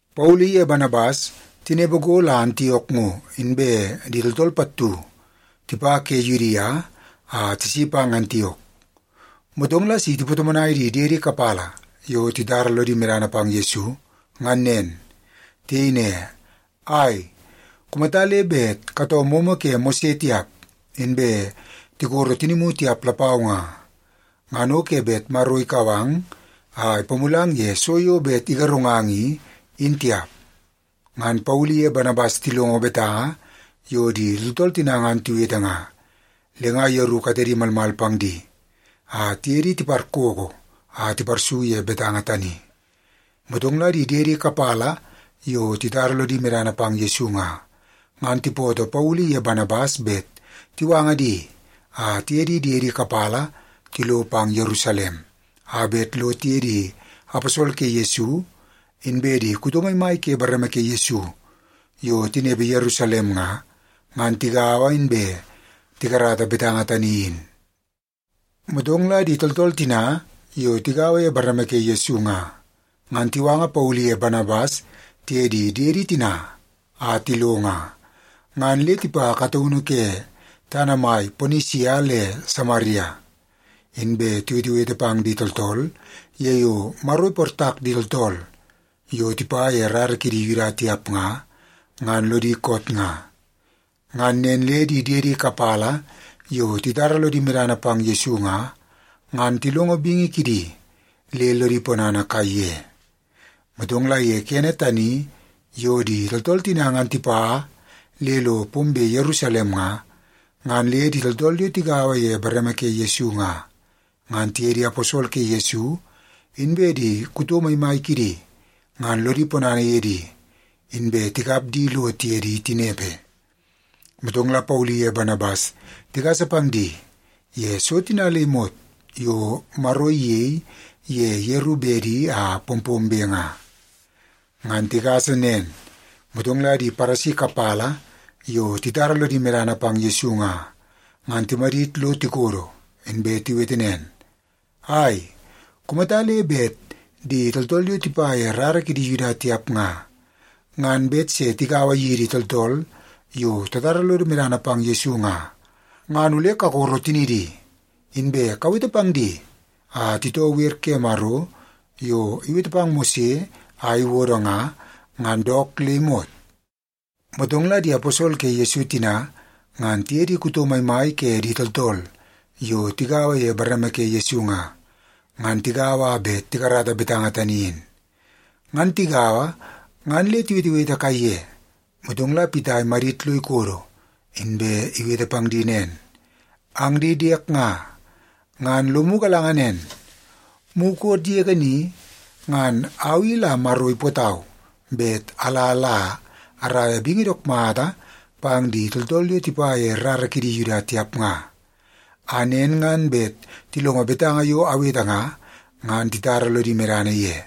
Paulu iye Banabas tinepe go la Antiok ngo, inbe di tooltool pattu tipa ke Yudia a tisi pang Antiok. Motong la si tipatomonai di diedi kapala yo titara lodi medana pang Yesu, ngan nen. Tiyei ne, “Ai, kumata le bet katoo momo ke Mose tiap, inbe tikoro tinimu tiap lapau nga, ngan o ke bet Maro ikau ang a ipamulang ye so yo bet igarungang i, in tiap.” Ngan Paulu iye Banabas tilongo betanga yo di tooltool tina ngan tiwete nga, le nga yeru katedi malmal pang di a tiye di tiparkookoo a tiparsu ye betanga tani. Motong la di diedi kapala yo titara lodi medana pang Yesu nga, ngan tipootoo Paulu iye Banabas bet tiwanga di a tiye di diedi kapala tilo pang Yerusalem a bet lo tiye di aposol ke Yesu, inbe di kuto maimai ke bareme ke Yesu yo tinepe Yerusalem nga, ngan tigaua inbe tikarata betanga tani in. Motong la di tooltool tina yo tigaua ye bareme ke Yesu nga, ngan tiwanga Paulu iye Banabas tiye di diedi tina a tilo nga, ngan le tipa kataunu ke tana mai Ponisia le Samaria. Inbe tiwetewete pang di tooltool ye yo Maro iportak di tooltool yo tipa ye rara kidi Yuda tiap nga, ngan lodi koot nga. Ngan nen le di diedi kapala yo titara lodi medana pang Yesu nga, ngan tilongo bingi kidi le lodi ponana kaiye. Motong la ye kene tani yo di tooltool tina ngan tipa le lo pombe Yerusalem nga, ngan le di tooltool yo tigaua ye bareme ke Yesu nga, ngan tiye di aposol ke Yesu, inbe di kuto maimai kidi ngan lodi ponana ye di, inbe tikap di lo tiye di tinepe. Motong la Paulu iye Banabas tigasa pang di ye so tina le imot yo Maro iyei ye yeru bedi a pompombe nga. Ngan tigasa nen, motong la di Paresi kapala yo titara lodi medana pang Yesu nga, ngan timadit lo tikodo, inbe tiwete nen, “Ai, kumata le bet di tooltool yo tipa ye rara kidi Yuda tiap nga, ngan bet se tigaua yidi tooltool yo tatara lodo medana pang Yesu nga, ngan ole kakoro tinidi, inbe kawete pang di a titoo wer ke Maro yo iwete pang Mose a iwodo nga, ngan dook le imot.” Motong la di aposol ke Yesu tina ngan tiye di kuto maimai ke di tooltool yo tigaua ye bareme ke Yesu nga, ngan tigaua a bet tikarata betanga tani in. Ngan tigaua ngan le tiwetewete kaiye, motong la Pita imadit lo ikodo, inbe iwete pang di nen, “Ang di diek nga, ngan lomu galanga nen, mukot yege ni ngan au i la Maro ipootau bet ala la araia bingi dook mata pang di tooltool yo tipa ye rara kidi Yuda tiap nga, a nen ngan bet tilongo betanga yo awete nga, ngan titara lodi medana ye.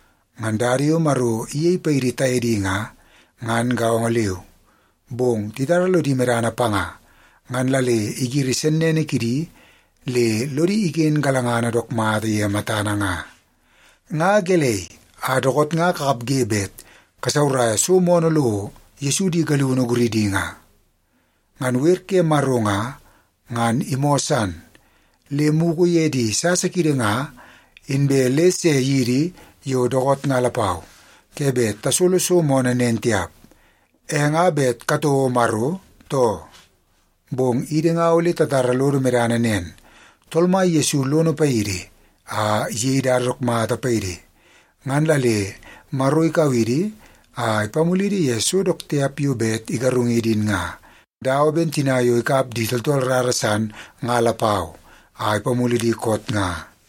Ngan dada yo Maro iyei paidi taye di nga, ngan gaongo leu. Bong titara lodi medana panga, ngan la le igiri sennene kidi le lodi iken galangana dook mata ye matana nga. Nga gelei, a dookoot nga kakapge bet kasauraia so moonoo lo Yesu di galiunu guridi nga? Ngan wer ke Maro nga, ngan imoo san, le mugu ye di sasa kiidi nga inbe le se yidi yo dookoot nga lapau, ke bet tasolo so moonoo nen tiap. E nga bet katouo Maro, too? Bong idi nga ole tatara lodo medana nen; Tool Mai Yesu lono paidi a iyei dada dook mata paidi, ngan la le Maro ikau idi a ipamulidi ye so dook tiap yo bet igarungidi in nga, dawa ben tina yo ikap di tooltool rara san nga lapau a ipamulu di koot nga.”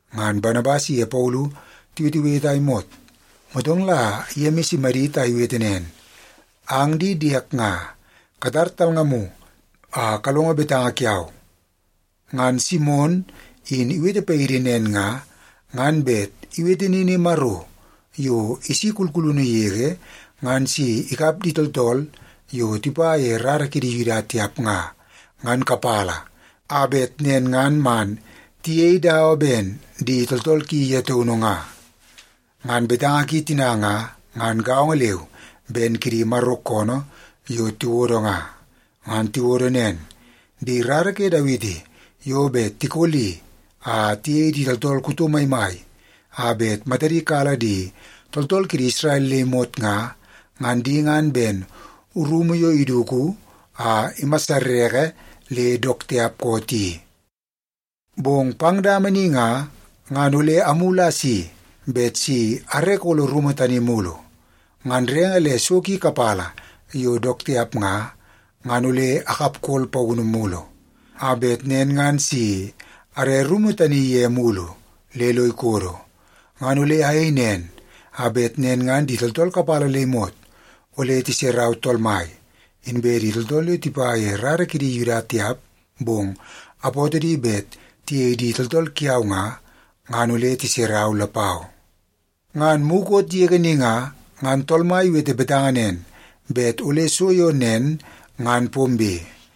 Ngan Banabas iye Paulu tiwetewete a imot, motong la Yemis imadit a iwete nen, “Ang di diek nga, katar talngamu a kalongo betanga kiau. Ngan Simon in iwete paidi nen nga, ngan bet iwete nini Maro yo isi kulkulunu yege ngan si ikap di tooltool yo tipa ye rara kidi Yuda tiap nga, ngan kapala, a bet nen ngan man tiyei dawa ben di tooltool ki ye taunu nga. Ngan betanga ki tina nga, ngan gaongo leu ben kidi Maro koonoo yo tiwodo nga. Ngan tiwodo nen, ‘Di rara ke Dawiti yo bet tikoli a tiyei di tooltool kuto maimai a bet matadi kala di tooltool kidi Isrel le imot nga, ngan di ngan ben rumu yo iduku a imasareke le dook tiap koot i. Bong pang dama ni nga, ngan ole amulu a asi bet si are kolo rumu tani mulu. Ngan renge le so ki kapala yo dook tiap nga, ngan ole akapkol paunu mulu, a bet nen ngan si are rumu tani ye mulu le lo ikodo. Ngan ole ayei nen, a bet nen ngan di tooltool kapala le imot ole tiserau Tool Mai, inbe di tooltool yo tipa ye rara kidi Yuda tiap bong apootoo di bet tiyei di tooltool kiau nga, ngan ole tiserau lapau. Ngan mukot yege ni nga, ngan Tool Mai iwete betanga nen bet ole so yo nen ngan pombe.’”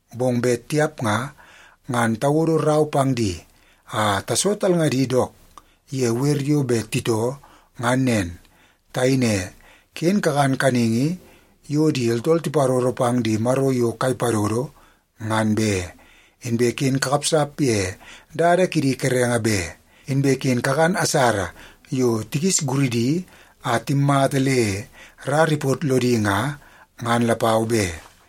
Bong bet tiap nga, ngan tawodo rau pang di a taso talngadi dook ye wer yo bet titoo, ngan nen. Tayei ne, ‘Ken kakan kaningi yo di tooltool tiparoro pang di maro yo kai padodo, ngan be. Inbe ken kakapsap ye dada kidi kerenge be. Inbe ken kakan asara yo tikis guridi a timmata le rara ipot lodi nga, ngan lapau be.’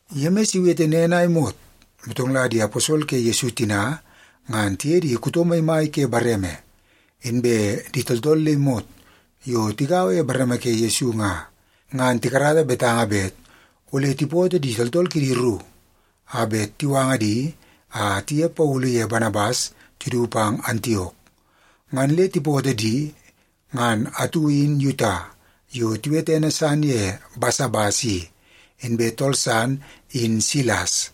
Yemis iwete nen a imot, motong la di aposol ke Yesu tina ngan tiye di kuto maimai ke bareme, inbe di tooltool le imot yo tigaua ye bareme ke Yesu nga, ngan tikarata betanga bet ole tipootoo di tooltool kidi ru a bet tiwanga di a tiye Paulu ye Banabas tidu pang Antiok. Ngan le tipootoo di, ngan atu in Yuta yo tiwete ene san ye Basabas i, inbe tool san in Silas.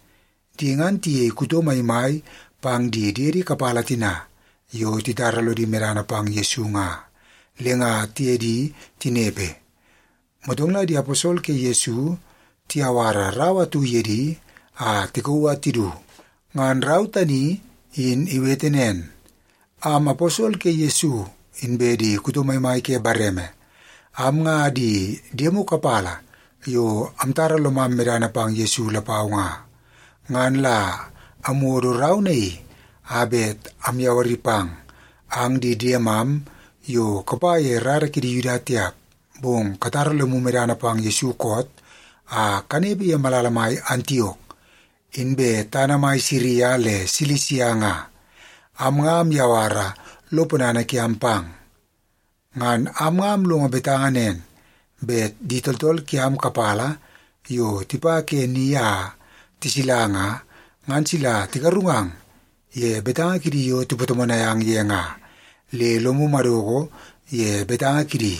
Di ngan tiyei kuto maimai pang di diedi kapala tina yo titara lodi medana pang Yesu nga, le nga tiye di tinepe. Motong la di aposol ke Yesu tiyawara rau atu ye di a tikauu a tidu. Ngan rau tani in iwete nen, Am aposol ke Yesu, inbe di kuto maimai ke bareme, am nga di diemu kapala yo amtara lomam medana pang Yesu lapau nga. Ngan la amwodo rau naii a bet amyawari pang, ang di diemam yo kapa ye rara kidi Yuda tiap, bong katara lomu medana pang Yesu koot a kanepe ye malala mai Antiok, inbe tana mai Siria le Silisia nga. Am nga amyawara lo ponana kiam pang. Ngan am nga amlongo betanga nen, bet di tooltool kiam kapala yo tipa ke ni a tisila nga, ngan sila tigarungang ye betanga kidi yo tipatomonai ang ye nga, le lomu madoko ye betanga kidi.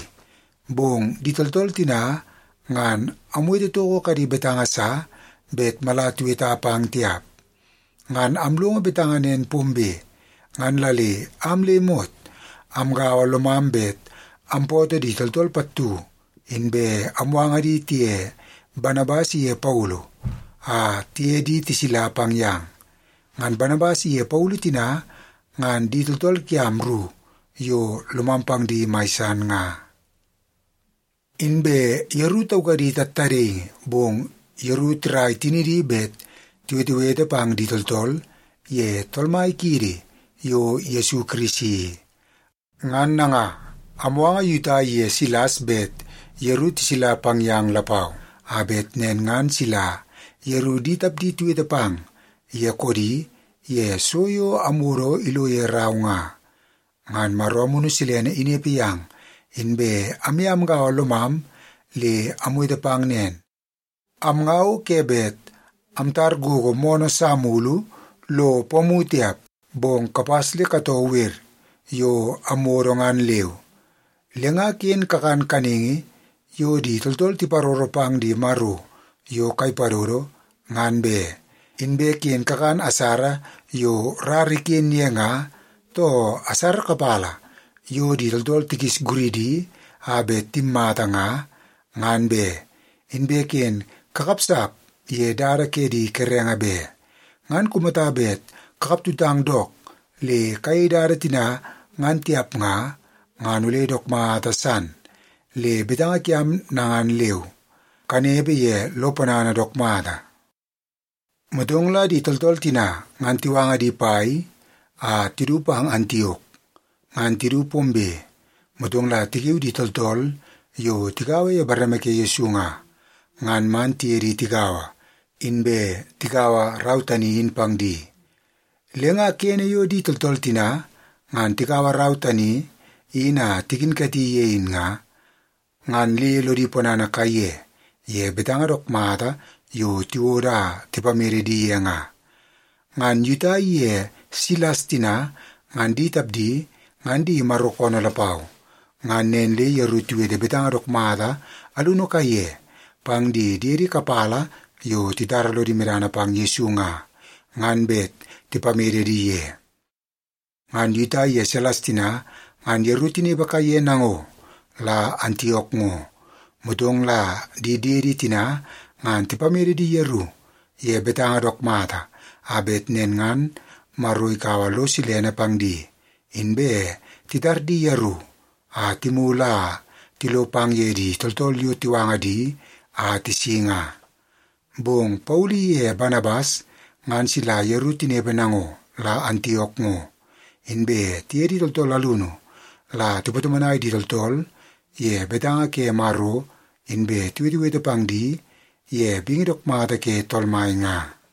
Bong di tooltool tina ngan amwete toko kadi betanga sa bet mala tiweta pang tiap. Ngan amlongo betanga nen pombe, ngan la le am le imot amgaua lomam bet ampootoo di tooltool pattu, inbe amwanga di tiye Banabas ye Paulu a tiye di tisila pang yang. Ngan Banabas iye Paulu tina ngan di tooltool kiam ru yo lomam pang di mai san nga. Inbe yeru taukadi tattadaingi, bong yeru tirai tinidi bet tiwetewete pang di tooltool ye Tool Mai kiidi yo Yesu Kirisi i. Ngan nanga, amwanga Yuta iye Silas bet yeru tisila pang yang lapau, a bet nen ngan sila yeru di tapdi tiwete pang ye koodi ye so yo amwodo ilo ye rau nga. Ngan Maro Amunu Silene inepe yam, inbe amye amgaua lomam le amwete pang nen. Am nga o ke bet amtar gogo moonoo sa mulu lo pomu tiap, bong kapas le katoo wer yo amwodo ngan leu. Le nga ken kakan kaningi yo di tooltool tiparoro pang di maro yo kai padodo, ngan be. Inbe ken kakan asara yo rara iken ye nga, too asara kapala yo di tooltool tikis guridi a bet timmata nga, ngan be. Inbe ken kakapsap ye dada ke di kerenge be. Ngan kumata bet kakap tutang dook le kayei dada tina ngan tiap nga, ngan ole dook mata san. Le betanga kiam nanga leu. Kanepe ye lo ponana dook mata. Motong la di tooltool tina ngan tiwanga di pai a tidu pang Antiok. Ngan tidu pombe, motong la tikiu di tooltool yo tigaua ye bareme ke Yesu nga, ngan man tiye di tigaua, inbe tikaua rau tani in pang di. Le nga kene yo di tooltool tina ngan tikaua rau tani in a tikinkati ye in nga, ngan le lodi ponana kaiye ye betanga dook mata yo tiwodo a tipamede di ye nga. Ngan Yuta iye Silas tina ngan di tapdi ngan di Maro koonoo lapau. Ngan nen le yeru tiwete betanga dook mata alunu kaiye pang di diedi kapala yo titara lodi medana pang Yesu nga, ngan bet tipamede di ye. Ngan Yuta iye Silas tina ngan yeru tinepe kaiye nango la Antiok ngo, motong la di diedi tina ngan tipamede di yeru ye betanga dook mata, a bet nen ngan Maro ikaua lo silene pang di, inbe titar di yeru a timulu a tilo pang ye di tooltool yo tiwanga di a tisi nga. Bong Paulu iye Banabas ngan sila yeru tinepe nango la Antiok ngo, inbe tiye di tooltool alunu la tipatomonai di tooltool ye betanga ke Maro, inbe tiwetewete pang di ye bingi dook mata ke Tool Mai nga.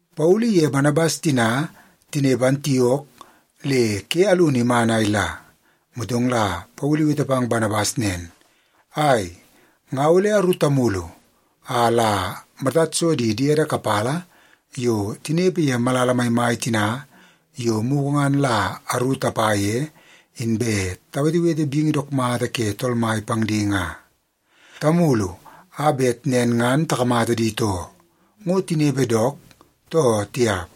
Paulu iye Banabas tina tinepe Antiok le ke alunu iman a ila, motong la Paulu iwete pang Banabas nen, “Ai, nga ole aru tamulu a la matad so di diedi kapala yo tinepe ye malala maimai tina yo mugu ngan la aru tapa ye, inbe tawetewete bingi dook mata ke Tool Mai pang di nga. Tamulu a bet nen ngan takamata di too, ngo tinepe dook, too tiap.”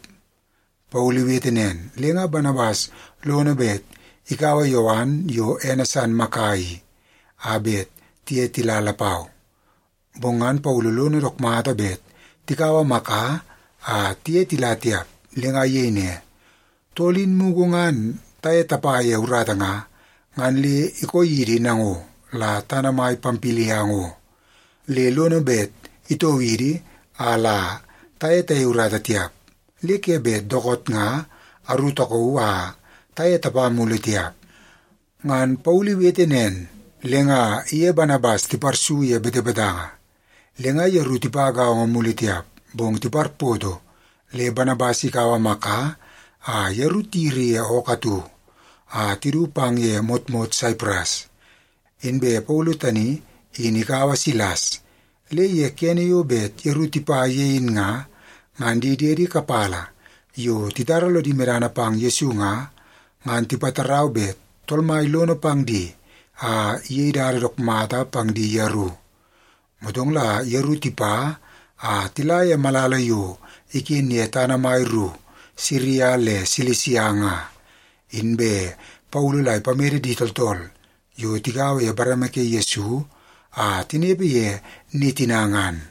Paulu iwete nen, le nga Banabas lono bet ikaua Yowan yo ene san Maka i, a bet tiye tila lapau. Bong ngan Paulu lono dook mata bet tikaua Maka a tiye tila tiap, le nga iyei ne, “Tool in mugu ngan taye tapa ye urata nga, ngan le ikoo yidi nango la tana mai Pampilia ngo, le lono bet itoo idi a la taye tayei urata tiap. Le ke bet dookoot nga aru takauu a taye tapa mulu tiap.” Ngan Paulu iwete nen, le nga iye Banabas tiparsu ye betebetanga. Le nga yeru tipa gaongo mulu tiap, bong tiparpoto le Banabas ikaua Maka a yeru tiyiri ye ookoo atu a tidu pang ye motmot Saipras. Inbe Paulu tani in ikaua Silas. Le ye kene yo bet yeru tipa ye in nga, ngan di diedi kapala yo titara lodi medana pang Yesu nga, ngan tipatarau bet Tool Mai lono pang di a iyei dada dook mata pang di yeru. Motong la yeru tipa a tila ye malala yo iken ye tana mai ru Siria le Silisia nga, inbe Paulu la ipamede di tooltool yo tigaua ye bareme ke Yesu a tinepe ye ni tina ngan.